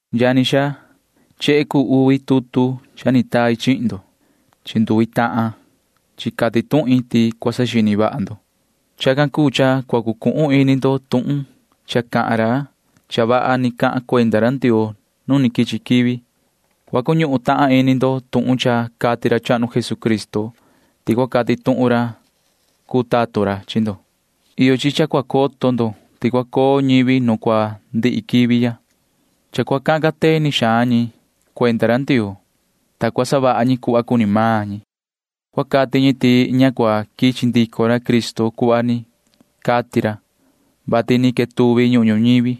Yani xaa, chehe cuu uvi tutu cha ni tai chihin ndo. Chi nduvi tahan chi cati tuhin ti cua saxini vaha ndo. Chacan cuu cha cua cuñuhun ini ndo tuhun cha cahan ra cha vaha ni cahan cuenda ra Ndioo nu quichi quivi. Cua cuñuhun tahan ini ndo tuhun cha cati ra chahnu Jesucristo ti cua cati tuhun ra cuu tatun ra chi ndo. Cua coto xihna ndo ti cua coo ñivi nu cua ndihi quivi ya, ta cua cahan cateni xaan ñi cuenda ra Ndioo, ta cua savaha ñi cuhva cuni maan ñi. Cua cati ñi ti ña cua quichi ndico maan ra Cristo cuhva ni cati ra, vati ni quetuvi ñuhun ñuñivi,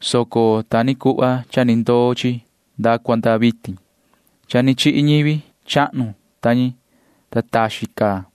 soco ta ni cuhva cha ni ndoo chi nda cua nda vitin. Cha ni chihi ñivi chahnu ta ñi, ta taxin caa.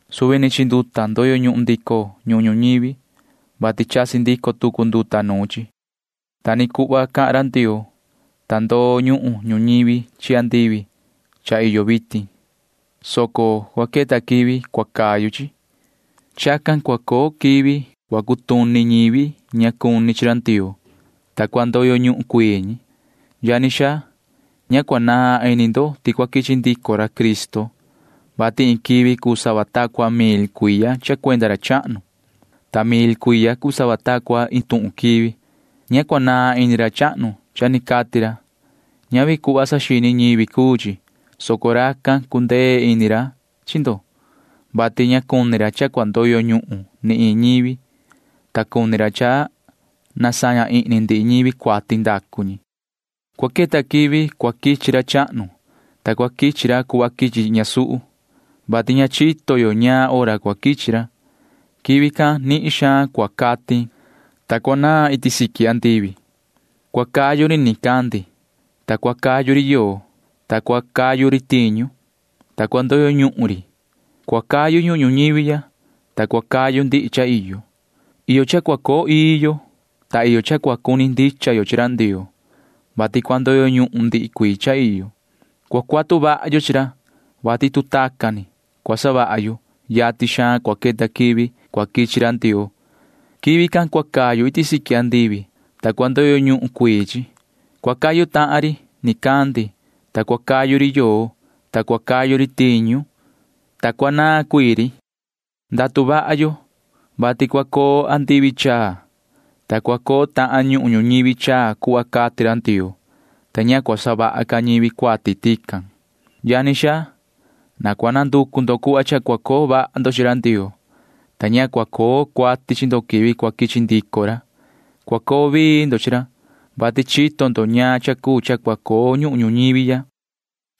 Suvi ni chi nduta ndoyo ñuhun ndico ñuhun ñuñivi, vati chasi ndico tucu nduta nuun chi. Ta ni cuhva cahan ra Ndioo, ta ndunahan ñuhun ñuñivi chi andivi cha iyo vitin, soco cua queta quivi cha cua cayu chi. Chacan cua coo quivi cua cutuni ñivi ña cuni chi ra Ndioo, ta cua ndoyo ñuhun cuii ñi. Yani xaa, ña cua naan ini ndo ti cua quichi ndico ra Cristo, vati iin quivi cuu sava ta cua iin mil cuiya cha cuenda ra chahnu, ta iin mil cuiya cuu sava ta cua iin tuhun ni quivi. Ña naan ini ra chahnu cha ni cati ra cuhva saxini ñivi. Ñavi tacan cuu chi, soco ti cundee ini ra chi ndo, vati ña cuni ra cha cua ndoyo ñuhun ni iin ñivi, soco cuni ra ti cua saña ihni ndihi ñivi cuati ndacu ñi. Cua queta quivi cua quichi ra chahnu, ta cua quichi ra cuhva quichi ñasuhu, [vati ña chito yo ñaan hora cua quichi ra]. Quivi can nihin xaan cua catin, ta cua naan iti siqui andivi. Cua cayu ri nicandi, ta cua cayu ri yoo, ta cua cayu ri tiñu, ta cua ndoyo ñuhun ri. Cua cayu ñuhun ñuñivi ya, ta cua cayu ndihi cha iyo. Iyo cha cua coo ii yo, ta iyo cha cua cuni ndicha yo chi ra Ndioo, vati cua ndoyo ñuhun ndihi cuii cha iyo. Cua cuatu vaha yo chi ra, vati tu tacan ni cua savaha yo, yatin xaan cua queta quivi cua quichi ra Ndioo. Quivi can cua cayu iti siqui andivi, ta cua ndoyo ñuhun cuii chi. Cua cayu tahan ri nicandi, ta cua cayu ri yoo, ta cua cayu ri tiñu, ta cua naan cuii maan ri. Ndatu vaha yo, vati cua coo andivi chaa, ta cua coo tahan ñuhun ñuñivi chaa cuhva cati ra Ndioo, ta ña cua savaha ca ñivi cuati tican. Yani xaa, na cua nanducu xaan ndo cuhva cha cua coo vaha ndo chi ra Ndioo, ta ña cua coo cuati chi ndo quivi cua quichi ndico ra. Cua coo vii ndo chi ra, vati chito ndo ñaan cha cuu cha cua coo nu ñuhun ñuñivi ya.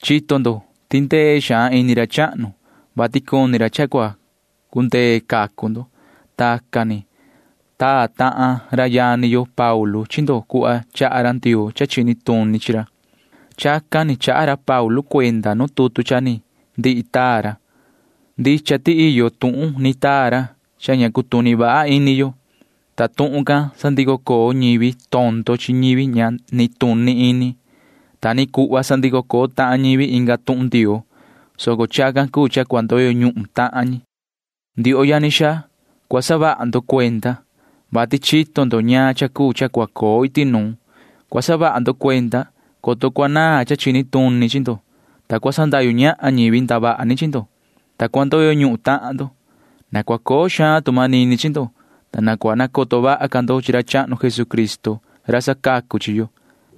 Cua coto ndo ti cundee xaan ini ra chahnu, vati cuni ra cha cua cundee cacu ndo. Tacan ni taa tahan ra yani yo Paulu chi ndo cuhva chaha ra Ndioo cha chini tuni chi ra. Chacan ni chaha ra Paulu cuenda nu ndihi tutu cha ni taa ra. Ndicha ti iyo tuhun ni taa ra cha ña cutuni vaha ini yo, ta tuhun can sandico coo ñivi tondo chi ñivi ña nituni ini. Ta ni cuhva sandico coo tahan ñivi inga tuhun Ndioo, soco chacan cuu cha cua ndoyo ñuhun tahan ñi. Ndioho yani xaa, cua saha ndo cuenda, vati chito ndo ñaan cha cuu cha cua coo iti nuun. Cua saha ndo cuenda, coto cua naan cha chini tuni chi ndo, ta cua sandahyu ñahan ñivi ndavaha ni chihin ndo, ta cua ndoyo ñuhun tahan ndo. Na cua coo ca tu manini chi ndo, ta na cua nacoto vaha ca ndo chi ra chahnu Jesucristo ra sacacu chi yo.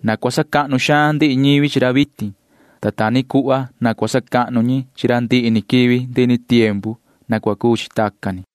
Na cua sacahnu xaan ndihi ñivi chi ra vitin, ta ta ni cuhva na cua sacahnu ñi chi ra ndihi ni quivi ndihi ni tiempu. Na cua cuu chi tacan ni.